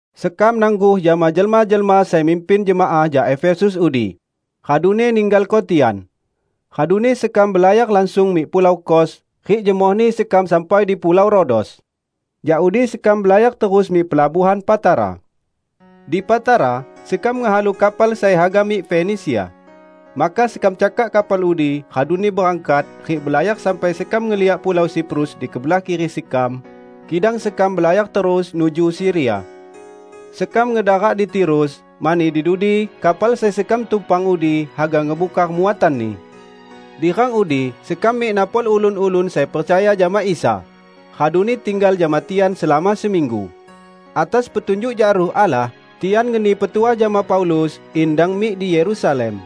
Sekam nangguh jama jelma-jelma sai mimpin jemaah jak Efesus udi, raduni ninggalko tian. Raduni sekam belayar langsung mik pulau Kos; rik jemohni sekam sampai di pulau Rodos. Jak udi sekam belayar terus mik pelabuhan Patara. Di Patara, sekam ngehalu kapal sai haga mik Fenisia. Maka sekam cakak kapal udi raduni berangkat rik belayar sampai sekam ngeliak pulau Siprus di kebelah kiri sekam; kidang sekam belayar terus nuju Siria. Sekam ngedarak di Tirus, mani di dudi kapal sai sekam tumpang udi haga ngebungkar muatanni. Di rang udi sekam mik napol ulun-ulun sai percaya jama Isa, raduni tinggal jama tian selama seminggu. Atas petunjuk jak Ruh Allah tian ngeni petuah jama Paulus in dang mik di Yerusalem.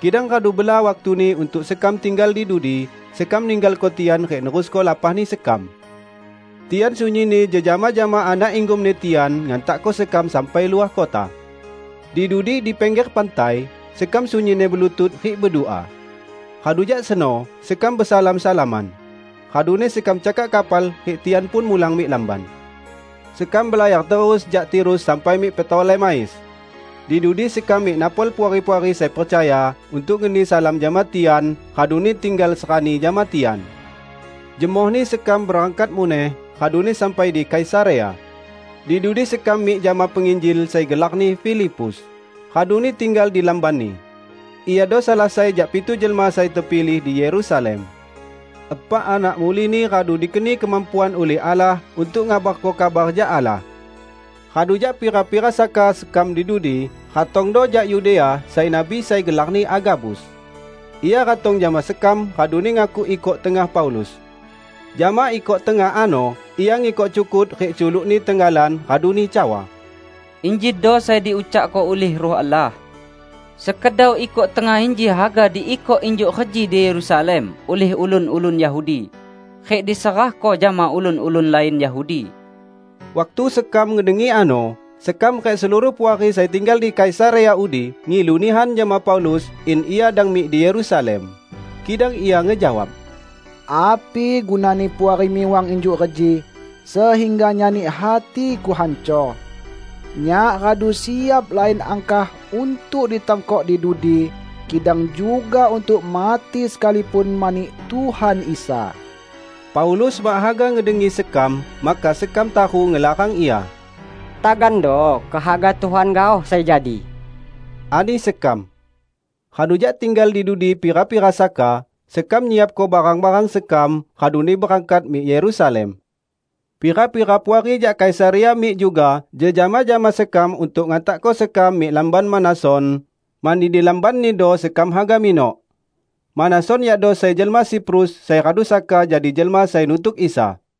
Kidang radu bela waktuni untuk sekam tinggal di dudi, sekam ninggalko tian rik nerusko lapahni sekam. Tian sunyinni jejama jama anak inggomni tian ngantakko sekam sampai luah kota. Di dudi di pingger pantai, sekam sunyinni belutut rik bedua. Radu jak seno sekam besalam-salaman, raduni sekam cakak kapal rik tian pun mulang mik lamban. Sekam belayar terus jak Tirus sampai mik Ptolemais. Di dudi sekam mik napol puari-puari sai percaya, untuk ngeni salam jama tian, raduni tinggal serani jama tian. Jemohni sekam berangkat muneh, raduni sampai di Kaisarea. Di dudi sekam mik jama penginjil sai gelarni Filipus, raduni tinggal di lambanni. Iado salah sai jak pitu jelma sai tepilih di Yerusalem. Epak anak mulini radu dikeni kemampuan ulih Allah untuk ngabarko kabar jak Allah. Radu jak pira-pira saka sekam di dudi, ratongdo jak Yudea sai nabi sai gelarni Agabus. Ia ratong jama sekam raduni ngakuk ikok tengah Paulus. Jama ikok tengah ano ia ngikok cukut rik culukni tenggalan raduni cawa, "Injido sai diucakko ulih Ruh Allah: Sekedau ikok tengah inji haga diikok injuk reji di Yerusalem ulih ulun-ulun Yahudi, rik diserahko jama ulun-ulun lain Yahudi." Waktu sekam ngedengi ano, sekam rik seluruh puari sai tinggal di Kaisarea udi ngilu nihan jama Paulus in ia dang mik di Yerusalem. Kidang ia ngejawab, "Api gunani Puari miwang injuk reji sehingga nyani hatiku hancor? Nyak radu siap lain angkah untuk ditangkok di dudi, kidang juga untuk mati sekalipun mani Tuhan Isa." Paulus mak haga ngedengi sekam, maka sekam taru ngelarang ia. "Tagando kehaga Tuhan gaoh sai jadi," ani sekam. Radu jak tinggal di dudi pira-pira saka, sekam nyiapko barang-barang sekam, raduni berangkat mik Yerusalem. Pira-pira puari jak Kaisarea mik juga jejama jama sekam untuk ngantakko sekam mik lamban Manason, mani di lambannido sekam haga minok. (Manason yakdo sai jelma Siprus sai radu saka jadi jelma sai nutuk Isa.)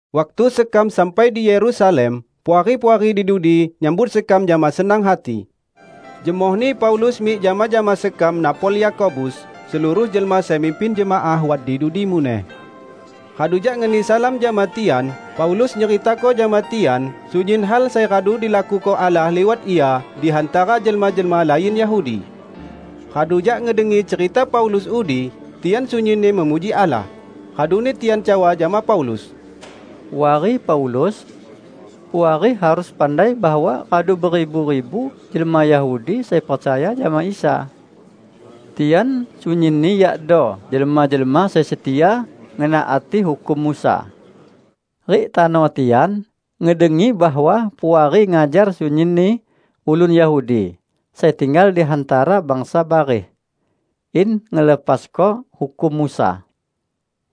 Waktu sekam sampai di Yerusalem, puari-puari di dudi nyambut sekam jama senang hati. Jemohni Paulus mik jama-jama sekam napol Yakobus; seluruh jelma sai mimpin jemaah wat di dudi muneh. Radu jak ngeni salam jama tian, Paulus nyeritako jama tian sunyin hal sai radu dilakuko Allah liwat ia di hantara jelma-jelma lain Yahudi. Radu jak ngedengi cerita Paulus udi, tian sunyinni memuji Allah. Raduni tian cawa jama Paulus, "Puari Paulus! Puari harus pandai bahwa radu beribu-ribu jelma Yahudi sai percaya jama Isa. Tian sunyinni yakdo jelma-jelma sai setia ngenaati hukum Musa. Rik tano tian ngedengi bahwa Puari ngajar sunyinni ulun Yahudi sai tinggal di hantara bangsa bareh, in ngelepasko hukum Musa.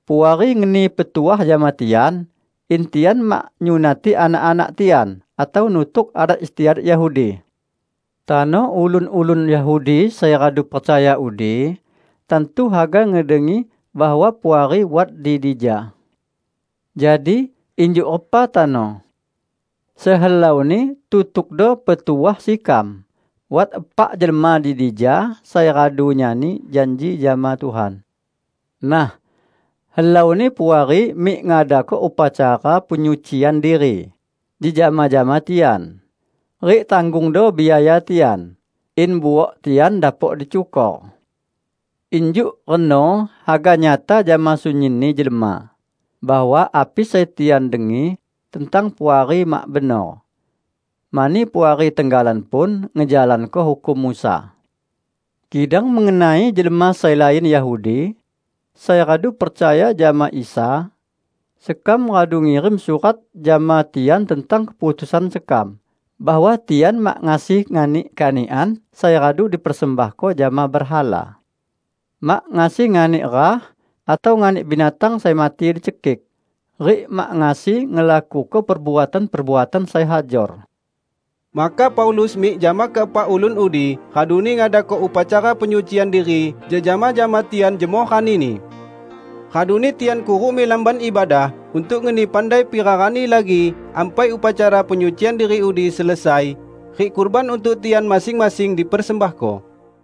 Puari ngeni petuah jama tian in tian mak nyunati anak-anak tian atau nutuk adat istiadat Yahudi. Tano ulun-ulun Yahudi sai radu percaya udi tantu haga ngedengi bahwa Puari wat di dija. Jadi, injuk repa tano? Sehelauni tutukdo petuah sekam. Wat epak jelma di dija sai radu nyani janji jama Tuhan. Nah, helauni Puari mik ngadako upacara penyucian diri jejama jama tian, rik tanggungdo biaya tian in buok tian dapok dicukor. Injuk reno haga nyata jama sunyinni jelma bahwa api sai tian dengi tentang Puari mak benor, mani Puari tenggalan pun ngejalanko hukum Musa. Kidang mengenai jelma sai lain Yahudi sai radu percaya jama Isa, sekam radu ngirim surat jama tian tentang keputusan sekam bahwa tian mak ngasi nganik kanikan sai radu dipersembahko jama berhala, mak ngasi nganik rah, atau nganik binatang sai mati dicekik; rik mak ngasi ngelakuko perbuatan-perbuatan sai hajor." Maka Paulus mik jama keepak ulun udi raduni ngadako upacara penyucian diri jejama jama tian jemoh ranini. Raduni tian kuruk mik Lamban Ibadah untuk ngeni pandai pira rani lagi ampai upacara penyucian diri udi selesai rik kurban untuk tian masing-masing dipersembahko.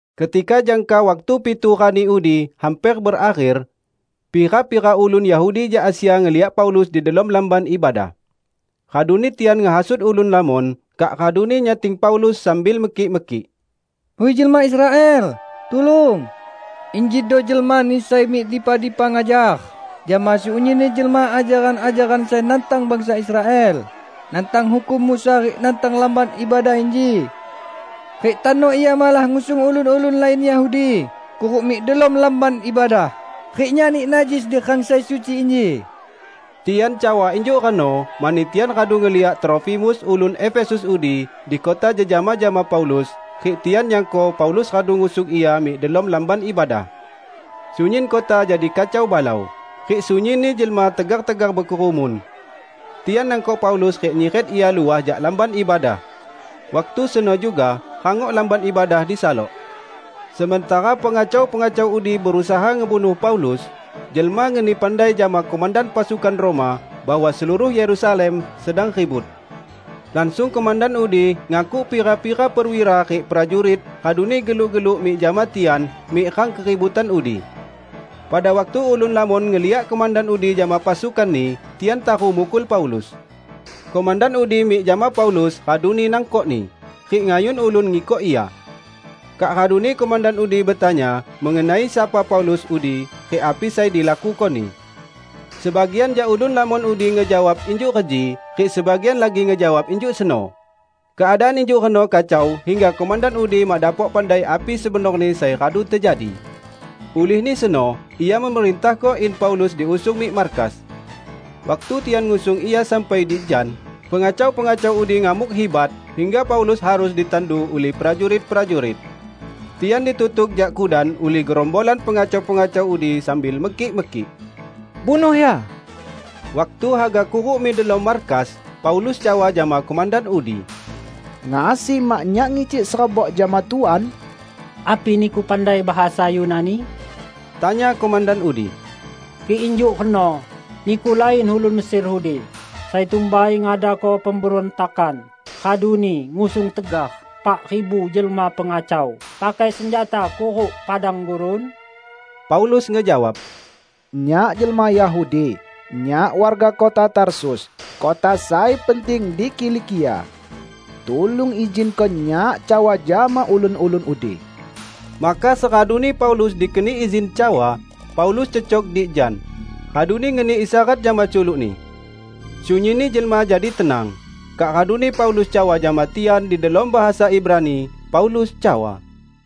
Ketika jangka waktu pitu rani udi hamper berakher, pira-pira ulun Yahudi jak Asia ngeliak Paulus di delom Lamban Ibadah. Raduni tian ngehasut ulun lamon, kak raduni nyating Paulus sambil mekik-mekik, "Hui jelma Israel, tulung! Injido jelmani sai mik dipa-dipa ngajar jama sunyinni jelma ajaran-ajaran sai nantang bangsa Israel, nantang hukum Musa rik nantang Lamban Ibadah inji. Rik tano ia malah ngusung ulun-ulun lain Yahudi kuruk mik delom Lamban Ibadah rik nyani najis di rang sai suci inji!" ( Tian cawa injuk reno mani tian radu ngeliak Trofimus ulun Efesus udi di kota jejama jama Paulus; rik tian nyangko Paulus radu ngusung ia mik delom Lamban Ibadah.) Sunyin kota jadi kacau balau, rik sunyinni jelma tegar-tegar bekerumun. Tian nangkok Paulus rik nyiret ia luah jak Lamban Ibadah. Waktu seno juga rangok Lamban Ibadah disalok. Sementara pengacau-pengacau udi berusaha ngebunuh Paulus, jelma ngeni pandai jama komandan pasukan Roma bahwa seluruh Yerusalem sedang ribut. Langsung komandan udi ngakuk pira-pira perwira rik prajurit raduni geluk-geluk mik jama tian mik rang keributan udi. Pada waktu ulun lamon ngeliak komandan udi jama pasukanni, tian taru mukul Paulus. Komandan udi mik jama Paulus raduni nangkokni, rik ngayun ulun ngikok ia. Kak raduni komandan udi betanya mengenai sapa Paulus udi rik api sai dilakukoni. Sebagian jak ulun lamon udi ngejawab injuk reji rik sebagian lagi ngejawab injuk seno. Keadaan injuk reno kacau hingga komandan udi mak dapok pandai api sebenorni sai radu tejadi. Ulihni seno ia memerintahko in Paulus diusung mik markas. Waktu tian ngusung ia sampai di jan, pengacau-pengacau udi ngamuk hibat hingga Paulus harus ditandu ulih prajurit-prajurit. Tian ditutuk jak kudan ulih gerombolan pengacau-pengacau udi sambil mekik-mekik, "Bunuh ia!" Waktu haga kuruk mik delom markas, Paulus cawa jama komandan udi, "Ngasi mak nyak ngicik serebok jama Tuan?" "Api niku pandai bahasa Yunani?" tanya komandan udi. "Kik injuk reno, niku lain ulun Mesir udi sai tumbai ngadako pemberuntakan raduni ngusung tegar epak ribu jelma pengacau pakai senjata kuruk padang gurun?" Paulus ngejawab, "Nyak jelma Yahudi; nyak warga kota Tarsus, kota sai penting di Kilikia. Tulung izinko nyak cawa jama ulun-ulun udi." Maka seraduni Paulus dikeni izin cawa, Paulus cecok di jan, raduni ngeni isyarat jama culukni. Sunyinni jelma jadi tenang. Kak raduni Paulus cawa jama tian di delom bahasa Ibrani. Paulus cawa,